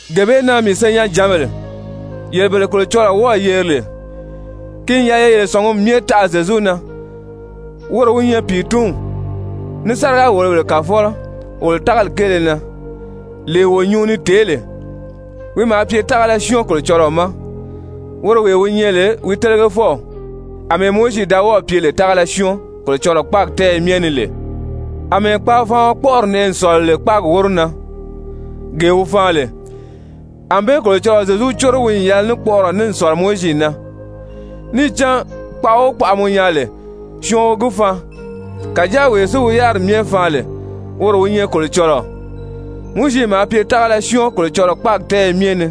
Gee bee na, mii senyɛnjǎnbèle, yele bele Kolocɔlɔɔ wɔ́ɔ̀ yeri lè, ki n yɛlɛ ye yele sɔ̀ngumi myɛ taʔa Zyezu na, woro wi nyɛ pìitunw ní sáriga-wòlobèle kàfɔlɔ wolo tágali kéele na, lee wo nyuu ni tèé lè. Wi maa pye tágala syɔ́ɔn Kolocɔlɔɔ ma woro wee wi nyɛ lè wi télegefɔw, àmɛɛ Mowizi da wɔ́ɔ̀ pye lè tágala syɔ́ɔn Kolocɔlɔɔ kpáagi tɛ́ɛyɛ myɛ ni lè. Amɛɛ kpaafaaɔn kpɔ́ʔɔri nɛʔɛ n sɔ̀lɔ lè kpáagi wóro na, gee wi faan lè, ànbée Kolocɔlɔɔ Zyezu córo wi n yɛlɛ ní kpɔʔɔrɔ ní n sɔ̀lɔ Mowizi na. Níì cán kpaʔa o kpaʔa mɔ nyaa lè, syɔɔn wi gi faan. Kàjáa wee si wi yáriri myɛ faan lè, woro wi nyɛ Kolocɔlɔɔ. Mowizi maa pye tágala syɔ́ɔn Kolocɔlɔɔ kpáagi tɛ́ɛyɛ myɛ ni,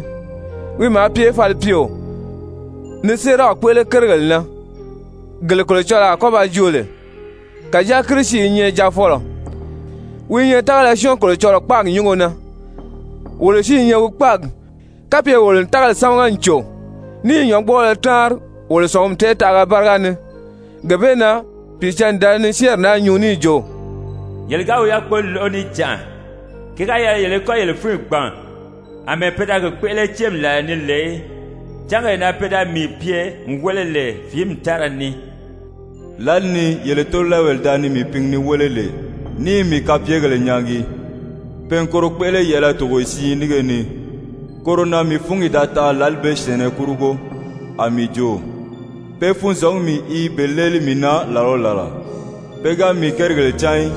wi maa pye falipyeo, ni séeraw kpéʔele kérigèle na, gele Kolocɔlɔɔ a kɔ́ ba joo lè. Kàjáa Kirisi i nyɛ Jaafɔlɔ, wi i nyɛ tágala syɔ́ɔn Kolocɔlɔɔ kpáagi nyúngo na. Wolo si i nyɛ wi kpáagi, kapye wolo n tágali sámaga n cò, ní i nyɔ̌ngbɔɔlɔ táanri wolo sɔ̀ngumi tɛɛtaʔaga báriga ni. Gee bee na Pìicǎnni da ni syɛ́ɛnri naa nyuu níì jo: «Yele ga wi yákpoli lóʔo níjanʔa, ki ga yɛlɛ yele í kɔ́ yele fúnyi gbàn àmɛɛ pe da gi kpéʔele céemi làla ni lè í, cángee na pe da mii pye n wéle lè fìími tára ni, lǎli ni yele tóolɛɛbèle da ni mii pingi ni wéle lè ní i mii kapyegèle nyaagi, pe n koro kpéʔele yɛ̀ʔɛlɛ togoye siin nínge ni. Koro na mii fúngi da tanʔa lǎli bee syɛ̀ɛnnɛ kurugo, a mii jo: Pe funzɔngumi i be léeli mii na làla o làla, pe ga mii kérigèle cán í.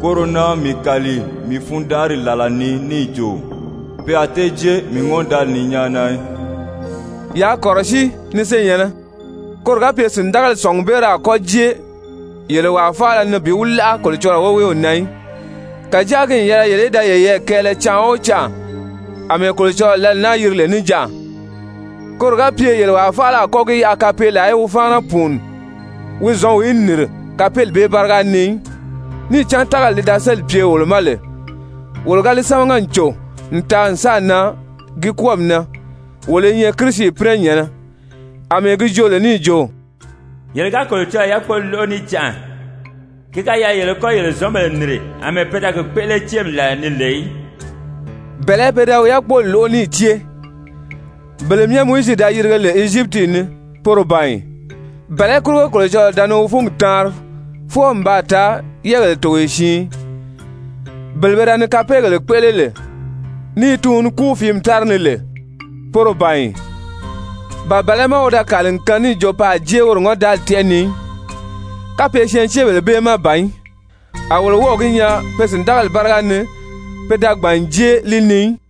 Koro na mii kàli mii fundanʔari làla ni níì jo: Pe a tée jée mii ŋɔ́ndaali ni nyáana í.» Yaa kɔ̀rɔsíi, ni senyɛ̀nnɛ, koro ga pye sìndagali sɔ̀ngubeere a kɔ́ jée yele wàa faala ni bi wi láʔa Kolocɔlɔɔ woweew na í. Kàjáa ki n yɛlɛ yele í da yeyɛɛ kɛɛlɛ canʔa o canʔa àmɛɛ Kolocɔlɔɔ lǎli naa yiri lè Níjanʔa, koro ga pye yele wàa faala a kɔ́ gi yaʔa kapeelaa í wi fáana pùuni wi zɔ̌nw í nìri kapeeli bee báriga ni í. Níì cán tágali li da sélì pye wolo ma lè, wolo ga li sámaga n cò n taa n sáà nan gi kwɔ́ɔmi na, wolo i nyɛ Kirisi pínɛnyɛ̀nnɛ, àmɛɛ gi joo lè níì jo: «Yele ga Kolocɔlɔɔ yákpoli lóʔo níjanʔa, ki ga yɛlɛ yele í kɔ́ yele zɔ̌nbèle nìri àmɛɛ pe da gi kpéʔele céemi làla ni lè í.» Bɛ̀lɛ́ pe da wi yákpoli lóʔo níì cée? Bele myɛ Mowizi da yirige lè Ezyipiti ni, poro ban ì? Bɛ̀lɛ́ kurugo Kolocɔlɔɔ da ni wi fúngi taanri fwɔɔ n baa taa yɛɛgéle togoye siin? Bele pe da ni kapeegèle kpéʔele lè ní i tuun ni kúu fìími tára ni lè, poro ban ì? Ba bɛ̀lɛ́ má wi da kàli n kaan níì jo pe a jée woro ŋɔ́ndaali tɛ́ʔɛ ni í, kapye syɛɛnceebèle bee má ban í? A wolo wɔ́ɔ̀ gi nyaa pe sìndagali báriga ni pe da gbàn n jée li ni í.